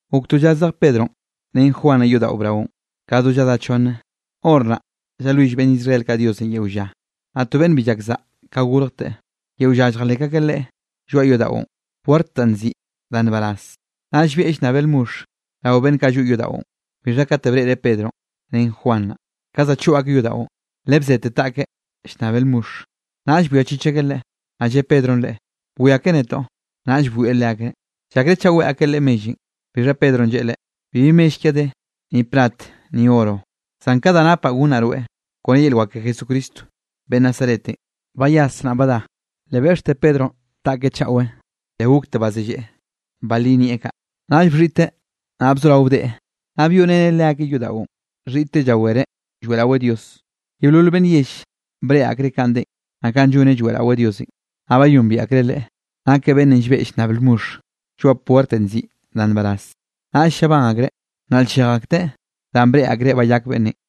Gok to lla zej Pedronꞌ ren Juan naꞌ yodaꞌo braonꞌ, ka do lladá chonne, hor naꞌ llalwill beꞌnn Israel kaꞌ Diosenꞌ yeo lla. Naꞌ to beꞌnn bi llak saꞌa ka gorjteꞌ, yeo lla lljalek akeꞌ leꞌe lloaꞌ yodaꞌon, puert danꞌ nziꞌi Da Nbaraz. Naꞌ llbieꞌ llnnabeꞌ lmoxh rao beꞌnn kaꞌ lloꞌ yodaꞌon. Bixha kate breꞌreꞌ Pedronꞌ ren Juan naꞌ, ka za choꞌ akeꞌ yodaꞌon, le bzete taꞌkeꞌ llnnabeꞌ lmoxh. Naꞌll bwiachich akeꞌ leꞌe, naꞌ lle Pedronꞌ leꞌe: —Bwiake netoꞌ. Naꞌll bwieꞌ leakeꞌ, llakreꞌ chaꞌ weꞌe akeꞌ leꞌe mellenꞌ. Bixha Pedronꞌ lleꞌe leꞌe: —Bibi mell kiaꞌ de, ni plat ni oro, zan ka da napaꞌ gonnaꞌ rweꞌ, kone yel wak ke Jesucristo beꞌnn Nazaretenꞌ, bayas naꞌ badá. Le beꞌxte Pedronꞌ taꞌkeꞌ chaꞌwe, le gokte bazelleꞌe, balí nieꞌ kaꞌ. Naꞌll bxhiꞌteꞌ naꞌ bzorao deꞌe, naꞌ byoꞌreneꞌ leakeꞌ yodaꞌon, xhiꞌteꞌ llawereꞌ lloeꞌraweꞌ Dios. Yeolol beꞌnn yell breꞌe akreꞌ kanꞌ deꞌen, naꞌ kanꞌ lloneꞌ lloeꞌraweꞌ Diosenꞌ. Naꞌ bayombiaꞌ akreꞌ leꞌe, nakeꞌ beꞌnnenꞌ llbeꞌ llnnab lmoxh lloaꞌ puertenꞌ nziꞌi Da Nbaraz. Naꞌll llabán akreꞌ, nnaꞌl-llej akteꞌ danꞌ breꞌe akreꞌ bayak beꞌnnenꞌ.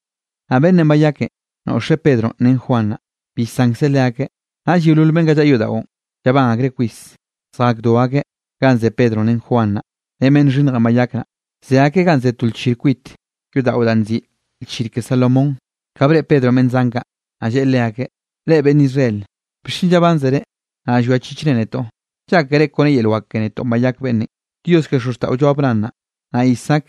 Naꞌ beꞌnnenꞌ bayakenꞌ, noꞌxeꞌ Pedronꞌ ren Juan naꞌ, bi llsankzeꞌ leakeꞌ. Naꞌll yeolol beꞌnn kaꞌ llaꞌa yodaꞌon, llabán akreꞌ kwis zjakdo akeꞌ ganꞌ ze Pedronꞌ ren Juan naꞌ, ren beꞌnn xhinnjenꞌ bayak naꞌ, ze akeꞌ ganꞌ ze to lchir kwit yodaꞌon da nziꞌi Lchir ke Salomón. Ka breꞌe Pedronꞌ beꞌnn zan kaꞌ, naꞌ lleꞌe leakeꞌ: —Reꞌ beꞌnn Israel, ¿bixchen llabánzere, naꞌ llwiachichre netoꞌ? ¿Llákere kone yel wak ke netoꞌn bayak beꞌnnenꞌ? Dios ke xozxtaꞌollo Abraham naꞌ, naꞌ Isaac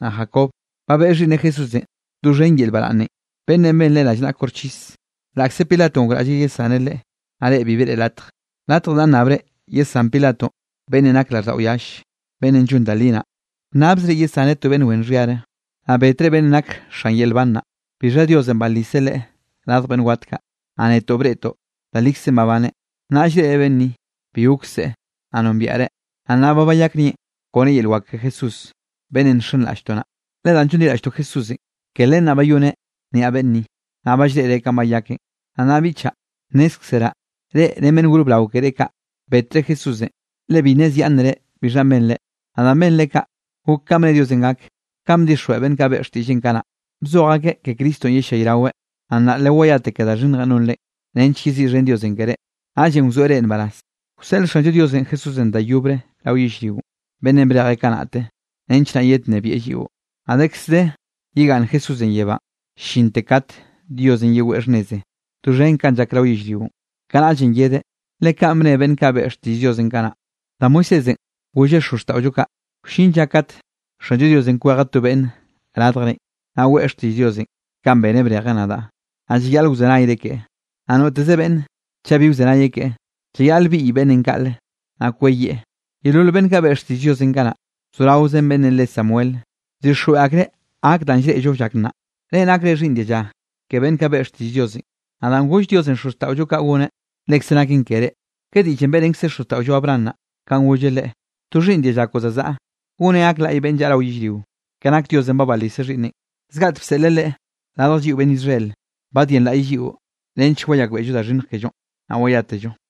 naꞌ Jacob, ba beꞌe Xhiꞌnneꞌ Jesúsenꞌ doxhen yel baraꞌnnenꞌ, beꞌnnenꞌ benre rallnaꞌa koxchis, laꞌkze Pilatonꞌ gokraꞌlleꞌ yesaneꞌ Leꞌe, naꞌ reꞌ bi beꞌre latje. Latje da bnnabre yesán Pilatonꞌ beꞌnnenꞌ nak raꞌlldaꞌo yall beꞌnnenꞌ llon da li naꞌ, bnnabzre yesaneꞌ to beꞌnn wen xhiare. Naꞌ betre beꞌnnenꞌ nak xan yel nban naꞌ. Bixha Diosenꞌ baliseꞌ Leꞌe radj beꞌnn wat kaꞌ, naꞌ netoꞌ breꞌtoꞌ da likzenꞌ babaneꞌ. Naꞌ llreꞌre beꞌnn ni, bi gok seꞌe, naꞌ nombiaꞌreꞌ, naꞌ nnaꞌ ba bayak nieꞌn kone yel wak ke Jesúsenꞌ, beꞌnnenꞌ nxenraꞌlltoꞌ naꞌ. Le danꞌ llonliraꞌlltoꞌ Jesúsenꞌ, ke len naꞌ bayoneꞌ niaꞌ beꞌnn ni, naꞌ ba llreꞌre kanꞌ bayakeꞌn. ’Naꞌ nnaꞌ biꞌchaꞌ, nnézkzeraꞌ, reꞌ ren beꞌnn gor brao keré kaꞌ, betre Jesúsenꞌ le bi nnezyaꞌnnere bixhanꞌ benre. Naꞌ danꞌ benre kaꞌ, gok kanꞌ bne Diosenꞌ gak, kanꞌ bdixjweꞌ beꞌnn kaꞌ beꞌe xtiꞌlleꞌn kanaꞌ, bzoj akeꞌ ke Cristonꞌ yellayraweꞌ. Naꞌ nnaꞌ lewayate ke da xhinnjenꞌ nonrenꞌ, nench yeziꞌxhen Diosenꞌ keré, naꞌllenꞌ wzoeꞌ reꞌ nbaraz. Wseꞌl Xanllo Diosenꞌ Jesúsenꞌ da yobre rao yellrionꞌ, beꞌnnenꞌ brejeꞌ kanaꞌte, nench naꞌ yednnebieꞌ lliꞌo. Naꞌ dekz de yegaꞌnn Jesúsenꞌ yebánꞌ, llinte kat Diosenꞌ yeweꞌ xhnneze doxhen kanꞌ llak rao yellrionꞌ. Kanaꞌllenꞌ yedeꞌ, le kaꞌn bne beꞌnn kaꞌ beꞌe xtiꞌll Diosenꞌ kanaꞌ. Da Moisésenꞌ golleꞌ xozxtaꞌollo kaꞌ: “Wllin lla kat Xanllo Diosenꞌ kwejeꞌ to beꞌnn radjrenꞌ, naꞌ weꞌe xtiꞌll Diosenꞌ kanꞌ beneꞌ brejeꞌ nadaꞌ, naꞌ llayaꞌl wzenayre keꞌe. Naꞌ noteze beꞌnn chaꞌ bi wzenayeꞌ keꞌe, llayaꞌl biꞌy beꞌnnenꞌ kaꞌle, naꞌ kweyieꞌ.” ’Yeolol beꞌnn kaꞌ beꞌe xtiꞌll Diosenꞌ kanaꞌ, bzoraozen beꞌnnenꞌ re Samuel, bdixjweꞌ akreꞌ gak danꞌ llreꞌllo llak nnaꞌ. Reꞌ nakre xhiꞌnn dialla ke beꞌnn kaꞌ beꞌe xtiꞌll Diosenꞌ, naꞌ danꞌ goll Diosenꞌ xozxtaꞌollo kaꞌ goneꞌ, lekze naken ke reꞌ. Ka diꞌllenꞌ beꞌrenkzeꞌ xozxtaꞌollo Abraham naꞌ, kanꞌ golleꞌ leꞌe: “To xhiꞌnn dialla koꞌon zazaꞌa, goneꞌ gak laꞌy beꞌnn llaꞌa rao yellrio.” Ke nak Diosenꞌ ba baliseꞌ Xhiꞌnneꞌn, zgaꞌtek bseꞌleꞌ Leꞌe radj lliꞌo beꞌnn Israelenꞌ, badyenlaꞌyeꞌ lliꞌo, nench wayakbeꞌllo da xhinnj kellonꞌ, naꞌ wayátello.